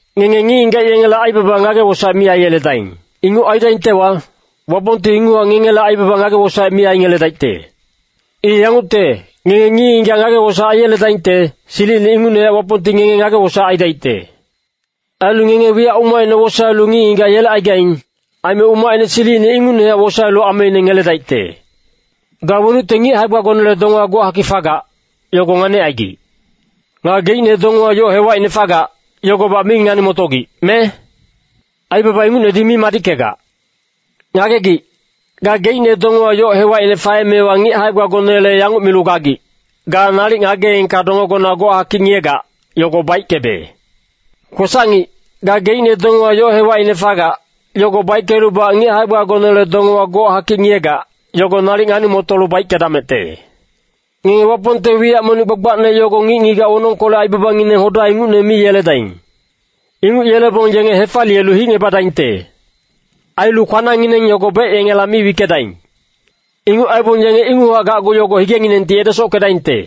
“Ngenge ngic-ngigac yengele aibaba ngage-wosaec mi aiyeledaing. Inguc aidaingtewa, Wapongti inguchac ngengele aibaba ngage-wosaec mi aingeledaicte. I yangucte, ngenge ngic-ngigac ngage-wosaec aiyeledaingte, silicine ingucnehac Wapongti ngenge ngage-wosaec aidaicte. Ailu ngenge wiyac umacine wosaelu ngic-ngigac yelecaigaing, aime umacine silicine ingucnehac wosaelu ameine ngeledaicte. “Ga wenucte ngic hae-gbagonele dongewa gochakic fagac, yogo nganicaigic. Nga geicne dongewa yoc hewacine fagac, yogobac mi ngani-motogic, me? Aibaba ingucnedi mi madickegac. Ngagegic, gageicne dongewa yoc hewacine faemewa ngic hae-gbagonele yanguc milu gagic, ‘Ga nalic ngageengka dongegona gochakic ngiyegac, yogo baickebe.’ Kwesac-ngic, gageicne dongewa yoc hewacine fagac, yogo baickelubac ngic hae-gbagonele dongewa gochakic ngiyegac, yogo nalic ngani-motolu baickedamecte. “Ngenge Wapongte wiyac monic gbagbacne yogo ngic-ngigac wonongkolec aibabangineng hoda ingucne mi yeledaing. Inguc yelebong yenge hefaliyelu hicngebadaingte. Ailu kwanangngineng yogo bec yengela mi wickedaing. Inguc aibong yenge inguchac gacgu yogo higenginengti edesockedaingte.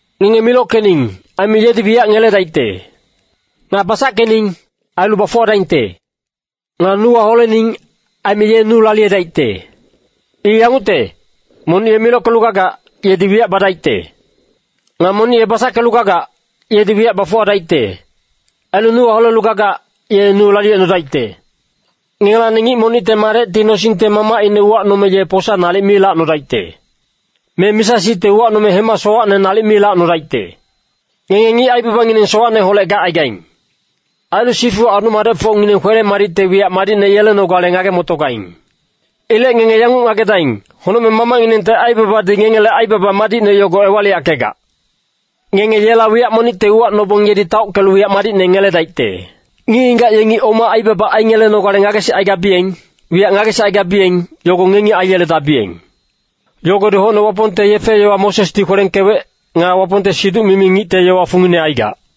“Ngenge milockening, aime yedi wiyac ngeledaicte. Nga basackening, ailu bafuwadaingte. Nga nuwa holening, aime ye nu laliyedaicte. I yangucte, monic ye milockelu gagac, yedi wiyac badaicte. Nga monic ye basackelu gagac, yedi wiyac bafuwadaicte. Ailu nuwa holelu gagac, ye nu laliyecnodaicte. “Ngengelacni ngic monicte madecti nosingte mamacine uwacnome ye posa nalic mi lacnodaicte. Me misa-sicte uwacnome hema sowacne nalic mi lacnodaicte. Ngenge ngic aibabangineng sowacneholec gacaigaing. Ailu sifu adu-madecfocngineng kwele-madicte wiyac madicne yelenogale ngage-motogaing. Ilec ngenge yanguc ngagedaing, Honocmeng Mamacnginengte aibabadi ngengele aibaba madicne yogo ewaliyackegac. Ngenge yela wiyac monicte uwacnobong yedi taockelu wiyac madicne ngeledaicte. “Ngic-ngigac yengi oma aibaba aingelenogale ngagesicaigabiyeng, wiyac ngagesicaigabiyeng, yogo ngengi aiyeledabiyeng. Yogodi hocne Wapongte yefe-yowa Mosesdi kwelengkewec, nga Wapongte siduc-mimi ngicte yowa fungine aigac.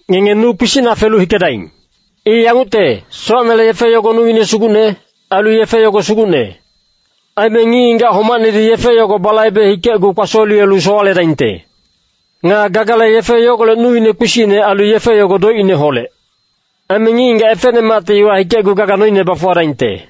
“Ngenge nu kpisicna felu hikedaing. I yangucte, sowacnele yefe yogo nuine sugucne, ailu yefe yogo sugucne. Aime ngic-ngigac homacnedi yefe yogo balaibe hikecgu kpasoliyelu sowaledaingte. Nga gagale yefe yogolec nuine kpisicne ailu yefe yogo doicineholec. Aime ngic-ngigac efecnemacti iwa hikecgu gaga noine bafuwadaingte.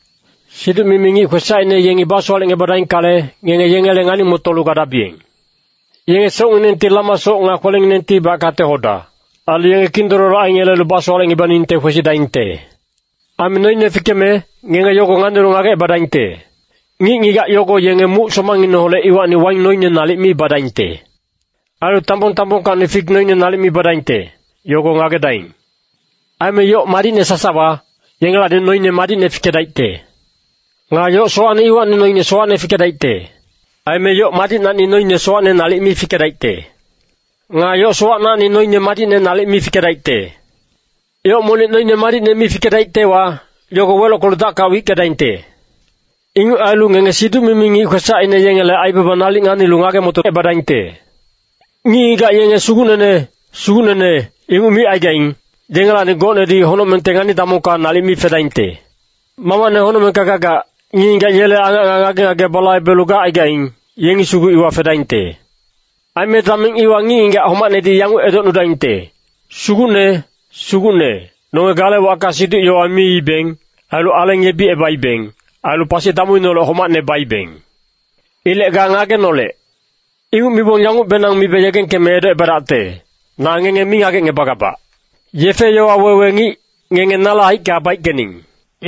“Siduc-mimi ngic kwesacine yengi basowalecngebadaingkale, ngenge yengele ngani-motolu gadabiyeng. Yenge socnginengti lama soc nga kwelenginengtibac kate-hoda, ailu yenge kindololo aingelelu basowalecngebaningte kwesidaingte. Aime noine fikeme, ngenge yogo nganilu ngagecebadaingte. Ngic-ngigac yogo yenge muc somangineholec iwacni waing noine nalic mi badaingte. Ailu tambong-tambongkacni fik noine nalic mi badaingte, yogo ngagedaing. Aime yoc madicne sasawa, yengelacni noine madicne fikedaicte. Nga yoc sowacne iwacni noine sowacne fikedaicte. Aime yoc madicnacni noine sowacne nalic mi fikedaicte. Nga yoc sowacnacni noine madicne nalic mi fikedaicte. Yoc monic noine madicne mi fikedaictewa, yogo welockelu dacka wickedaingte. Inguc ailu ngenge siduc-mimi ngic kwesacine yengele aibaba nalic nganilu ngage-motocebadaingte. “Ngic-ngigac yenge ‘Sugucnene, Sugucnene,’ inguc micaigaing, yengelacni gocnedi honocmengte ngani-damongka nalic mi fedaingte. Mamacne honocmengka gagac, ngic-ngigac yele angac nga ngage-ngage balaibelu gacaigaing, yengi sugu iwa fedaingte. Aime dameng iwa ngic-ngigac homacnedi yanguc edocnudaingte, ‘Sugucne, Sugucne, nonge gale wacka siduc-yowa miibeng, ailu aleng yebicebaibeng, ailu pasi damuineholec homacne baibeng. Ilec ga ngagenolec.’ Inguc mibong yangucbenang mibe yegengkeme edocebadacte, ‘Na ngenge mi ngagecngebagabac. Yefe-yowa wewe ngic, ngenge nale haicka baickening.’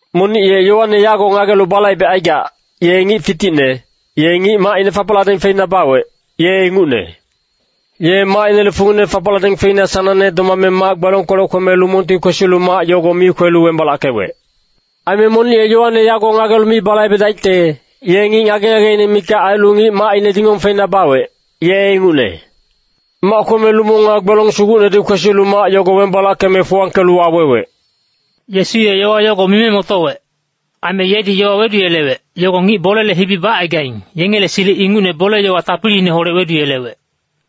“Monic ye yowane yago ngagelu balaibecaigac, ye ngic fiticne, ye ngic macine fapacladeng feina bawec, ye ingucne. Ye macinele fungine fapacladeng feina sanangne domame mac-gbelongkolec kweme lumongti kwesilu mac yogo mi kwelu wembalackewec. Aime monic ye yowane yago ngagelu mi balaibedaicte, ye ngic ngage-ngageine mikac ailu ngic macine dingong feina bawec, ye ingucne. Mac kweme lumong nga gbelong sugucnedi kwesilu mac yogo wembalackeme fuwangkelu wawewec.” Yesu ye yowa yogo mime motowec. Aime yedi yowa weduyelewec, yogo ngic bolele hibi bacaigaing, yengele silic ingucne bole-yowa tapiliineholec weduyelewec.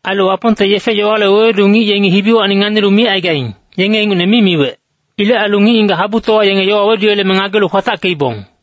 Ailu Wapongte yefe-yowale wewedu ngic yengi hibiwacni nganilu micaigaing, yenge ingucne mi miwec. Ilec ailu ngic-ngigac habutowa yenge yowa weduyeleme ngagelu kwatackeibong.